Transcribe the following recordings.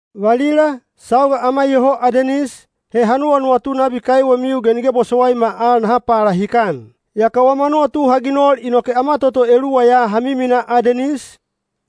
Valila, sauga ama iyoho Adenis, he ha nuwanuwatu nabi kaiwemiu ge nige bosowaima al naha palahikan. Yaka wama nuwatu ha ginol inoke ama toto eluwa ya ha miminaa Adenis,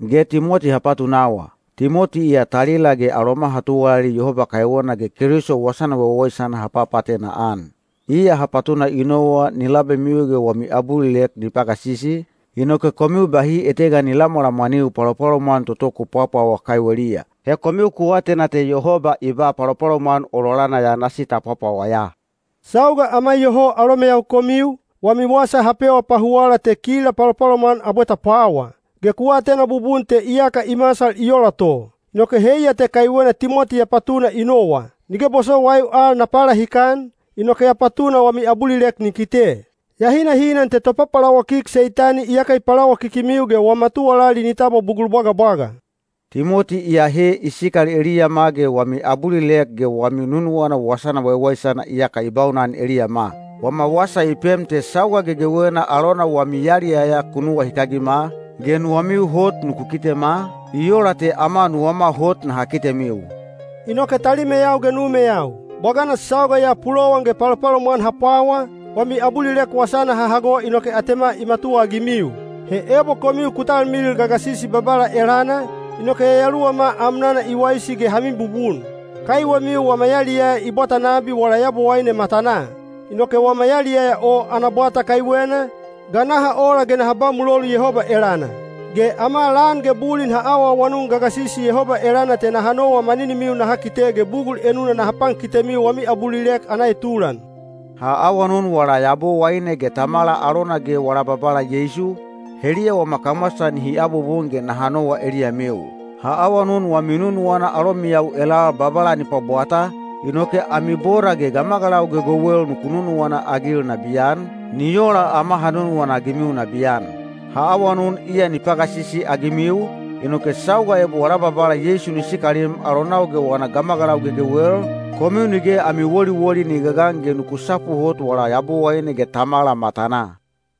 ge Timoti ha patunawa. Timoti iya talila ge aloma ha tuwalali Yehoba kaiwena ge Keliso Wasana Waiwaisana ha papaatena-an. Iya ha patuna i nowa ni labemiu ge wami abulilek ni ba pagasisi, inoke komiu bahi etega ni lamwalamwaniu palopalomwan toto ku pwawa kaiweliya. He komiu ku atena te Yehoba i ba palopalomwan ololana ya nasi ta pwapwawa ya. Sauga ama iyoho alomeyau komiu, wami wasa ha pewa pahuwala te kila palopalomwan abwe ta pwawa. Ge ku atena bubun te iyaka i masal i ola to. Inoke heiya te kaiwena Timoti ya patuna i nowa. Nige bosowaiu al na palahikan, inoke ya patuna wami abulilek ni kite. Ya hinahinan te topapalawakik Seitani iyaka i palawakikimiu ge wama tuwalali ni tabwa bugul bwagabwaga. Timoti iyahe i sikal eliyama ge wami abulilek ge wami nunuwana wasana waiwaisana iyaka i baunan eliyama. Wama wasa i pem te sauga gegewena alona wami yaliyaya ku nuwahikagima, ge nuwamiu hot nuku kitema, i ola te ama nuwama hot naha kitemiu. Inoke talimeyau ge numeyau, bwagana sauga ya pulowan ge palopalomwan ha pwawa, wami abulilek wasana ha hago inoke atema i matuwaagimiu. He ebo komiu ku talmilil gagasisi Babala elana, inoke yayaluwama amnana i waisi ge ha mibubun. Kaiwemiu wama yaliyaya i bwata nabi wala Yabowaine matanaa. Inoke wama yaliyaya o ana bwata kaiwena, ga naha ola ge naha ba mulolu Yehoba elana? Ge ama lan ge bulin ha awaawanun gagasisi Yehoba elana te naha nowa maninimiu naha kite ge bugul enuna naha pankitemiu wami abulilek ana etulan. Ha awanun wala Yabowaine ge Tamala alona ge wala Babala Yeisu, heliya wama kamwasa nihi abubun ge naha nowa eliyamiu. Ha awanun wami nunuwana alomiyau elal Babala ni pwabwata, inoke ami boda ge gamagalau gegewel nuku nunuwana-agil nabiyan, ni ola ama ha nunuwana-agimiu nabiyan. Ha awanun iya ni pagasisi-agimiu, inoke sauga ebo wala Babala Yeisu ni sikalim alonau ge wana gamagalau gegewel, komiu nige ami woliwoli ni gagan ge nuku sapu hot wala Yabowaine ge Tamala matanaa.